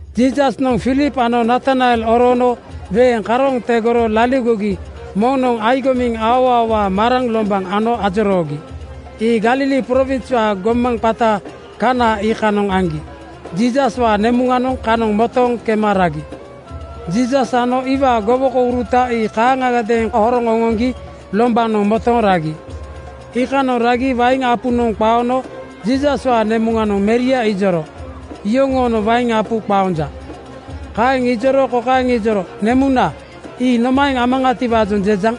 Jiisasnoŋ Filip ano Natanael oroono weeŋ karooŋ tegoro laligogi moŋnoŋ agomiŋ aoaowaa maraŋ lombaŋ ano ajoroogi. Ii Galili prowinswaa gomaŋ qata Kaana iikanoŋ aŋgi. Jiisaswaa nemuŋanoŋ kanoŋ motooŋ kema ragi. Jiisas ano iwaa gowokouruta ii kaaŋagadeeŋ horoŋ oŋoŋgi lombanoŋ motooŋ ragi. Iikanoŋ ragi wain apunoŋ qaono Jiisaswaa nemuŋanoŋ meria ijoro, “Yoŋoonoŋ wain apu qaonja.” Kaeŋ ijoro kokaeŋ ijoro, “Nemuna, ii nomaeŋ amaŋatiwaajoŋ jejaŋ?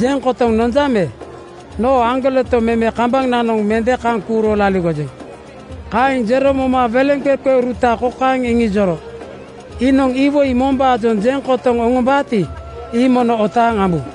Jeŋ kotoŋ nonjaŋ me? Noo aŋgoleto meme kambananoŋ mende kaŋ kuuro laligojeŋ.” Kaeŋ jero moma weleŋqeqeuruta kokaeŋ iŋijoro, “Iinoŋ iwoi mombaajoŋ jeŋ kotoŋ oŋombaati, ii mono otaaŋ ambu.”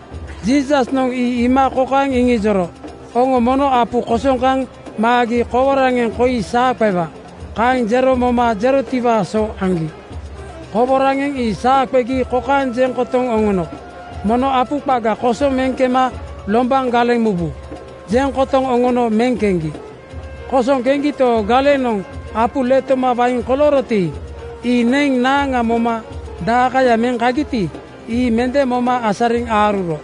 Jiisasnoŋ ii iima kokaeŋ iŋijoro, “Oŋo mono apu kosoŋ kaŋ maagi koworaŋeŋ koi saa qewa.” Kaeŋ jero moma jerotiwaa so aŋgi. Koworaŋeŋ ii saa qegi kokaeŋ jeŋ kotoŋ oŋono, “Mono apu qaga kosoŋ meŋ kema lombaŋ galeŋ mubu.” Jeŋ kotoŋ oŋono meŋ keŋgi. Kosoŋ keŋgito, galenoŋ apu letoma wain kolooroti, ii neŋ naaŋa moma daeŋkaya meŋ kagiti, ii mende moma asariŋ aaruro.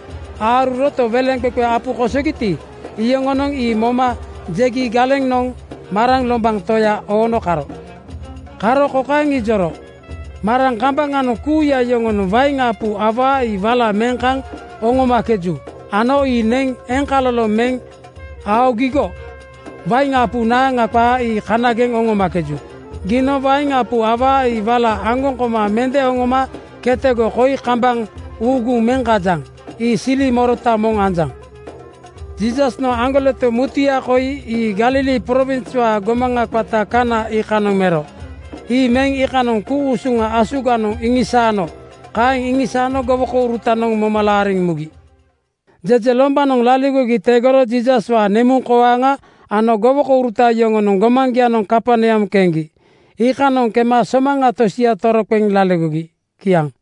Aaruroto, weleŋqeqe apu kosogiti, iyoŋonoŋ ii moma jegi galenoŋ maraŋ lombaŋ toya oono karo. Karo kokaeŋ ijoro, “Maraŋ kambaŋanoŋ kuuya yoŋonoŋ wain apu awaa ii wala meŋ kaŋ oŋomakeju ano ii neŋ eŋkaloloŋ meŋ aogigo wain apu naaŋa qaa ii kanageŋ oŋomakeju. Giinoŋ wain apu awaa ii wala aŋgoŋ koma mende oŋoma ketego koi kambaŋ uuguŋ meŋ kajaŋ. Ii sili morota moŋ anjaŋ.” Jiisasnoŋ aŋgoleto mutuya koi ii Galili prowinswaa gomaŋa qata Kaana iikanoŋ mero. Ii meŋ iikanoŋ ku-usuŋa asuganoŋ iŋisaano. Kaeŋ iŋisaano gowokourutanoŋ moma laariŋ mugi. Jejelombanoŋ laligogi tegoro Jiisaswaa nemuŋkoaaŋa ano gowokouruta yoŋonoŋ gomaŋgianoŋ Kaperneam keŋgi. Iikanoŋ kema somaŋa tosia toroqeŋ laligogi. Kiaŋ.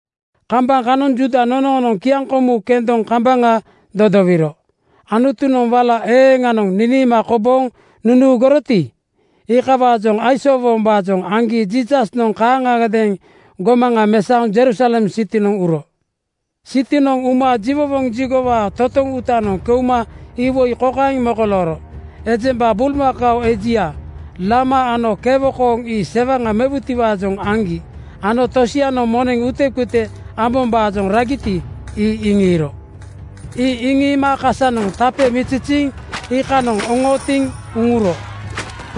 Kambaŋ kanoŋ Juuda nonoonoŋ kiaŋkomu kendoŋ kambaŋa dodowiro. Anutunoŋ wala eeŋanoŋ niniima kobooŋ nunuuguroti, iikawaajoŋ aisoowombaajoŋ aŋgi Jiisasnoŋ kaaŋagadeeŋ gomaŋa mesaoŋ Jerusalem sitinoŋ uro. Sitinoŋ uma jiwowoŋ jigowaa totoŋ uutanoŋ keuma iwoi kokaeŋ mokolooro: Ejemba bulmakao ejia, lama ano kewo kooŋ ii sewaŋa mewutiwaajoŋ aŋgi ano tosianoŋ moneŋ utekute ambombaajoŋ ragiti, ii iŋiiro. Ii iŋiima kasanoŋ tape (qoilomu) miziziiŋ iikanoŋ oŋootiŋ uŋuro.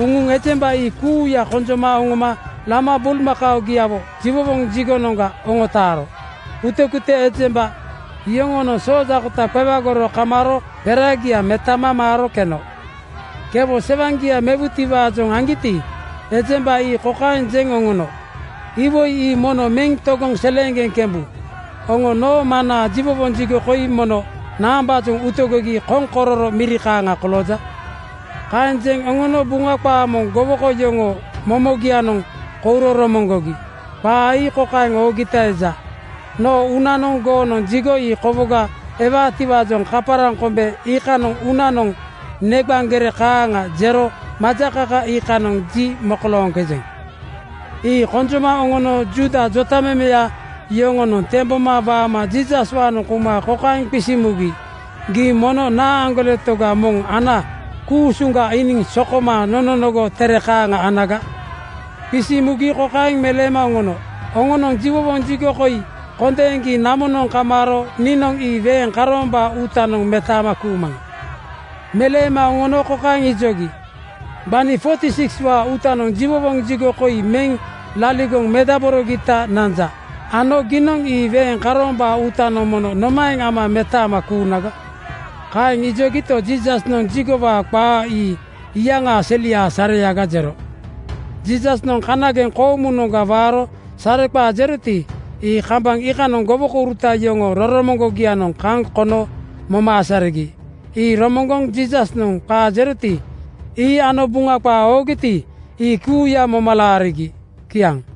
Uŋuŋ ejemba ii kuuya konjoma oŋoma lama bulmakaogiawo jiwowoŋ jigonoŋga oŋotaaro. Utekute ejemba yoŋoonoŋ soojaakota qewagoro kamaaro peragia metama maaro keno. Kewo sewaŋgia mewutiwaajoŋ aŋgiti, ejemba ii kokaeŋ jeŋ oŋono, “Iwoi ii mono meŋ togoŋ seleeŋgeŋ kembu. Oŋo noo Maŋnaa jiwowoŋ jigo koi mono naambaajoŋ utegogi koŋkororo miri kaaŋa kolooja?” Kaeŋ jeŋ oŋono Buŋa qaa moŋ gowoko yoŋoo momogianoŋ kouro romoŋgogi. Qaa ii kokaeŋ oogita eja, “Noo uunanoŋ goonoŋ jigo ii kowoga ewaatiwaajoŋ kaparaŋ kombe iikanoŋ uunanoŋ neqaŋ gere kaaŋa jero majakaka iikanoŋ ji mokolooŋkejeŋ.” Ii konjoma oŋono Juuda jotamemeya yoŋonoŋ temboma waama Jiisaswaanoŋ kouma kokaeŋ qisiŋ mugi, “Gii mono naa aŋgoleto moŋ ana ku-usuŋga iiniŋ sokoma nononogo tere kaaŋa anaga?” Kaeŋ qisiŋ mugi kokaeŋ meleema oŋono, “Oŋonoŋ jiwowoŋ jigo koi kondeeŋgi namonoŋ kamaaro niinoŋ ii weeŋ karoombaa uutanoŋ metaama kuumaŋa.” Meleema oŋono kokaeŋ ijogi, “Gbani 46:waa uutanoŋ jiwowoŋ jigo koi meŋ laligoŋ medaborogita nanja ano giinoŋ ii weeŋ karoombaa uutanoŋ mono nomaeŋ ama metaama kuunaga?” Kaeŋ ijogito, Jiisasnoŋ jigowaa qaa ii iyaŋaa seliaa sareaga jero. Jiisasnoŋ kanageŋ koomunoŋga waaro sareqaa jeroti, ii kambaŋ iikanoŋ gowokouruta yoŋoo roromoŋgogianoŋ kaŋ kono moma asarigi. Ii romoŋgoŋ Jiisasnoŋ qaa jeroti, ii ano Buŋa qaa oogiti, ii kuuya moma laarigi. Kiaŋ.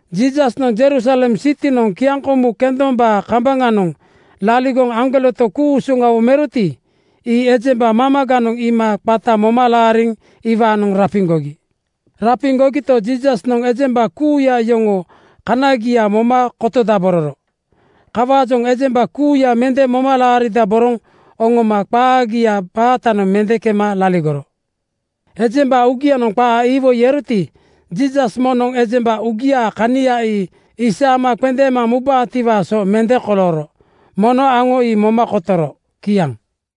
Jiisasnoŋ Jerusalem sitinoŋ kiaŋkomu kendombaa kambaŋanoŋ laligoŋ aŋgoleto ku-usuŋawo meroti, ii ejemba mamaganoŋ iima qata moma laariŋ iwaanoŋ rapiŋgogi. Rapiŋgogito, Jiisasnoŋ ejemba kuuya yoŋoo kanagia moma kotodabororo. Kawaajoŋ ejemba kuuya mende moma laaridaboroŋ oŋoma qaagiaa baatanoŋ mende kema laligoro. Ejemba uugianoŋ qaa iwoi eroti, Jiisas moŋnoŋ ejemba uugiaa kania ii isaama qendeema mubaatiwaa so mende kolooro. Mono aŋo ii moma kotoro. Kiaŋ.